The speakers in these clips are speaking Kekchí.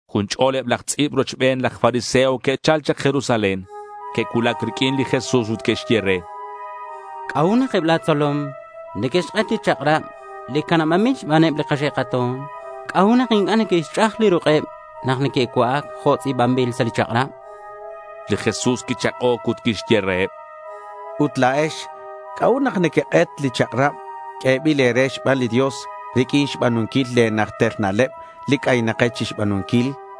Jun ch'ol eb aj tz'i̱b rochbeneb laj fariseo que'chal chak Jerusalén. Que'cuulac riq'uin li Jesús ut que'xye re: —¿C'a'ut nak eb la̱ tzolom neque'xk'et li chak'rab li canabanbil xbaneb li kaxe' kato̱n? ¿C'a'ut nak inc'a' neque'xch'aj li ruk'eb nak neque'cua'ac jo' tz'i̱banbil sa' li kachak'rab? chanqueb. Li Jesús quichak'oc ut quixye reheb: —Ut la̱ex, ¿c'a'ut nak nequek'et li chak'rab q'uebil e̱re xban li Dios riq'uin xba̱nunquil le̱ najter na'leb li c'aynakex chixba̱nunquil?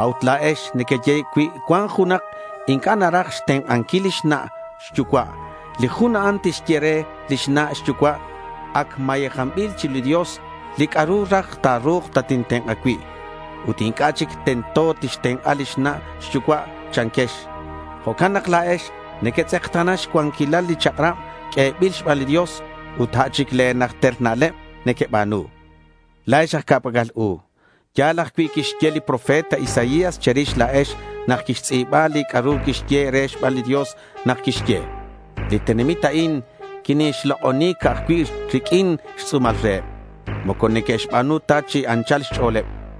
A'ut la̱ex nequeye cui cuan junak inc'a' naraj xtenk'anquil lix na' xyucua', li jun a'an tixye re lix na' xyucua', “ac mayejanbil chiru li Dios li c'a'ru raj ta̱ru̱k tatintenk'a cui'.” Ut inc'a' chic tento tixtenk'a lix na' xyucua', chanquex. Jo'can nak la̱ex nequetz'ekta̱na xcuanquil li chak'rab q'uebil xban li Dios ut a' chic le̱ najter na'leb nequeba̱nu. La̱ex aj ca'pac'al u. Ya̱l ajcui' li quixye li profeta Isaías che̱rix la̱ex nak quixtz'i̱ba li c'a'ru quiyehe' re xban li Dios nak quixye: Li tenamit a'in niquine'xlok'oni ca'aj cui' riq'uin xtz'u̱mal reheb. Moco neque'xba̱nu ta chi anchal xch'o̱leb.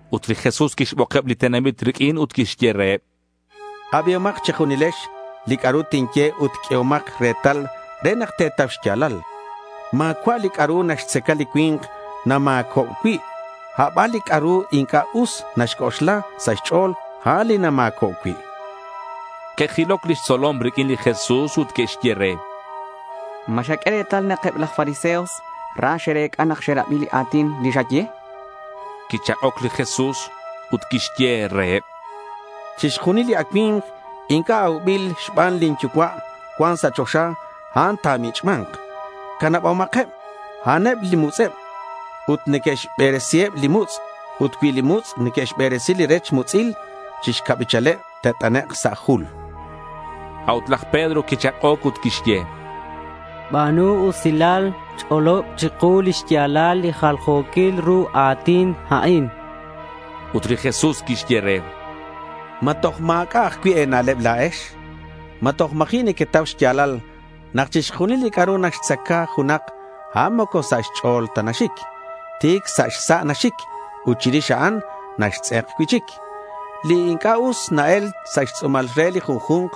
Ut li Jesús quixbokeb li tenamit riq'uin ut quixye reheb: —Abihomak che̱junilex li c'a'ru tinye ut q'uehomak retal re nak te̱tau xya̱lal. Ma̱cua' li c'a'ru naxtzaca li cui̱nk nama̱co' cui'; aban li c'a'ru inc'a' us naxc'oxla sa' xch'o̱l, a'an li nama̱co' cui'.— Que'jiloc lix tzolom riq'uin li Jesús ut que'xye re: —¿Ma xaq'ue retal nak eb laj fariseos ra xe'rec'a nak xe'rabi li a̱tin li xaye?— Quichak'oc li Jesús ut quixye reheb: —Chixjunil li acui̱mk inc'a' aubil xban lin Yucua' cuan sa' choxa, a'an ta̱mich'ma̱nk. Canabomakeb. A'aneb mutz'eb ut neque'xberesiheb li mutz'. Ut cui li mutz' neque'xberesi li rech mutz'il, chi xcabichaleb te't'anek' sa' jul.— A'ut laj Pedro quichak'oc ut quixye: —Ba̱nu usilal, ch'olob chiku li xya̱lal li jaljo̱quil ru a̱tin a'in.— Ut li Jesús quixye re: —¿Ma toj ma̱c'a' ajcui' e̱na'leb la̱ex? ¿Ma toj ma̱ji' nequetau xya̱lal nak chixjunil li c'a'ru naxtzaca junak, a'an moco sa' xch'o̱l ta naxic? Ti̱c sa' xsa' naxic ut chirix a'an naxtz'ek cui'chic. Li inc'a' us na-el sa' xtz'u̱mal re li junju̱nk,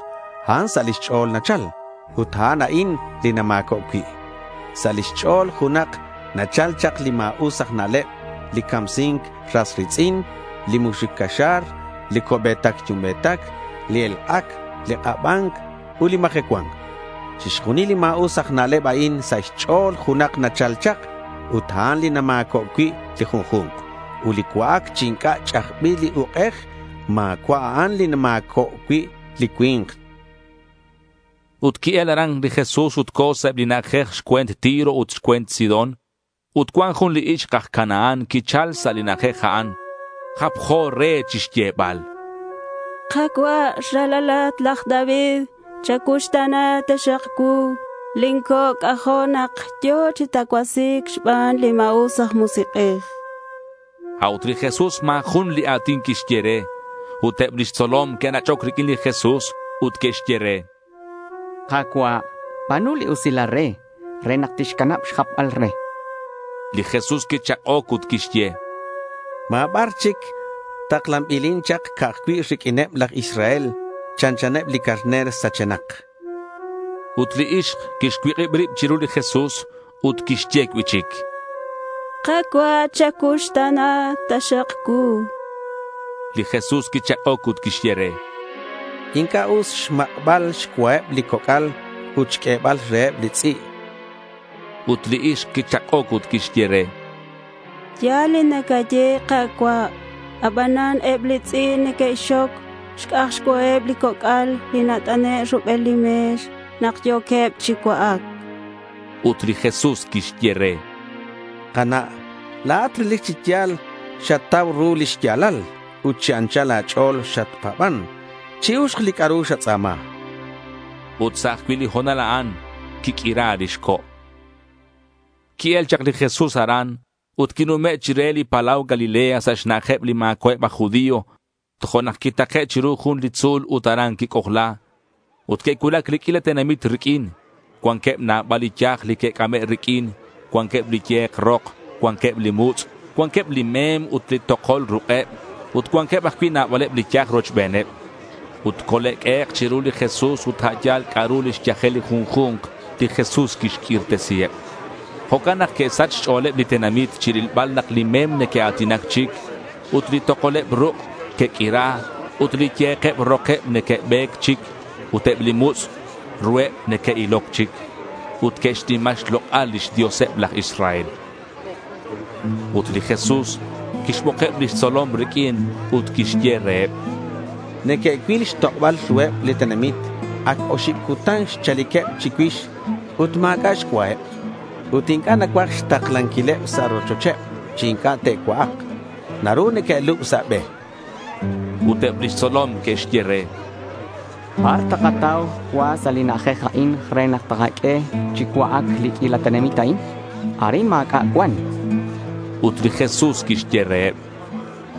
a'an sa' lix ch'o̱l nachal. Ut a'an a'in li nama̱co' cui'. Sa' lix ch'o̱l junak nachal chak li ma̱us aj na'leb, li camsi̱nc ras ri̱tz'in, li muxuc caxa̱r, li co'be̱tac yumbe̱tac, li elk'ac, li k'aba̱nc ut li majecua̱nc. Chixjunil li ma̱us aj na'leb a'in sa' xch'o̱l junak nachal chak, ut a'an li nama̱co' cui' li junju̱nk. Ut li cua'ac chi inc'a' ch'ajbil li uk'ej, ma̱cua' a'an li nama̱co' cui' li cui̱nk, chan. Ut qui-el aran li Jesús ut co̱ sa' eb li na'ajej xcue̱nt Tiro ut xcue̱nt Sidón. Ut cuan jun li ixk aj Canaán quichal sa' li na'ajej a'an. Japjo re chixyebal: —Ka̱cua', Ralalat laj David, chacuuxta̱na taxak cuu. Lin co' c'ajo' nak yo̱ chi tacuasi̱c xban li ma̱us aj musik'ej, chan. A'ut li Jesús ma̱ jun li a̱tin quixye re. Ut eb lix tzolom que'nach'oc riq'uin li Jesús ut que'xye re: —Ka̱cua', ba̱nu li usilal re, re nak tixcanab xjapbal re, chanqueb. Li Jesús quichak'oc ut quixye: —Ma̱ bar chic taklanbilin chak, ca'aj cui' riq'uineb laj Israel. Chanchaneb li carner sachenak, chan. Ut li ixk quixcuik'ib rib chiru li Jesús ut quixye cui'chic: —Ka̱cua', chacuuxta̱na taxak cuu.— Li Jesús quichak'oc ut quixye re: —Inc'a' us xmak'bal xcuaheb li coc'al ut xq'uebal reheb li tz'i', chan li Jesús. Ut li ixk quichak'oc ut quixye re: —Ya̱l li nacaye, Ka̱cua', abanan eb li tz'i' neque'xxoc xc'aj xcuaheb li coc'al li nat'ane' rubel li me̱x nak yo̱queb chi cua'ac, chan. Ut li Jesús quixye re: —Kana', la̱at relic chi ya̱l xatau ru li xya̱lal ut chi anchal a̱ch'o̱l xatpa̱ban. Chi-uxk li c'a'ru xatz'a̱ma, chan. Ut sa' ajcui' li ho̱nal a'an quiq'uira lix co'. Qui-el chak li Jesús aran, ut quinume' chire li palau Galilea sa' xna'ajeb li ma̱cua'eb aj judío. Tojo'nak quitake' chiru jun li tzu̱l ut aran quic'ojla. Ut que'cuulac li q'uila tenamit riq'uin. Cuanqueb nabal li yaj li que'c'ame' riq'uin. Cuanqueb li ye̱k rok, cuanqueb li mutz', cuanqueb li mem ut li tokol ruk'eb, ut cuanqueb ajcui' nabaleb li yaj rochbeneb. Ut cole'q'uehek' chiru li Jesús ut a' yal c'a'ru lix yajel li junju̱nk, li Jesús quixq'uirtesiheb. Jo'can nak que'sach xch'o̱leb li tenamit chirilbal nak li mem neque'a̱tinac chic ut li tokoleb ruk' que'q'uira ut li ye̱keb rokeb neque'be̱c chic ut eb li mutz' ruheb neque'iloc chic. Ut que'xnima xlok'al lix Dioseb laj Israel. Ut li Jesús quixbokeb lix tzolom riq'uin ut quixye reheb: —Neque'cuil xtok'oba̱l ruheb li tenamit. Ac oxib cutan xchaliqueb chicuix ut ma̱c'a' xcuaheb. Ut inc'a' nacuaj xtaklanquileb sa' rochocheb chi inc'a' te'cua'ak. Naru neque'lub sa' be, chan. Ut eb lix tzolom que'xye re: —¿Bar takatau cua sa' li na'ajej a'in re takaq'ueheb chi cua'ac li q'uila tenamit a'in? Arin ma̱c'a' cuan, chanqueb. Ut li Jesús quixye reheb: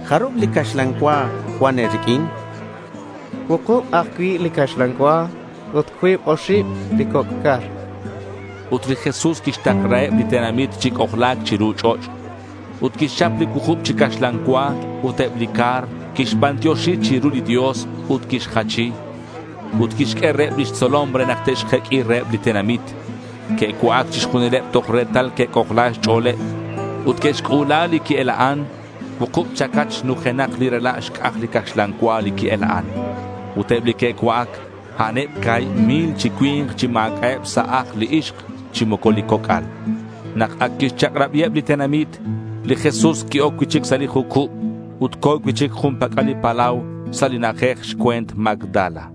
—¿Jarub li caxlan cua cuan e̱riq'uin? chan. —Cuukub ajcui' li caxlan cua ut cuib oxib li coc' car, chanqueb re. Ut li Jesús quixtaklaheb li tenamit chi c'ojla̱c chiru ch'och'. Ut quixchap li cuukub chi caxlan cua ut eb li car, quixbantioxi chiru li Dios ut quixjachi. Ut quixq'ue reheb lix tzolom re nak te'xjeq'ui reheb li tenamit. Que'cua'ac chixjunileb toj retal que'c'ojla xch'o̱leb. Ut que'xc'u̱la li qui-ela'an. Cuukub chacach nujenak li rela' xc'aj li caxlan cua li qui-ela'an. Ut eb li que'cua'ac, a'aneb ca̱hib mil chi cui̱nk chi ma̱c'a'eb sa' ajl li ixk chi moco li coc'al. Nak ac quixchak'rabiheb li tenamit, li Jesús qui-oc cui'chic sa' li jucub ut co̱ cui'chic jun pac'al li palau sa' li na'ajej xcue̱nt Magdala.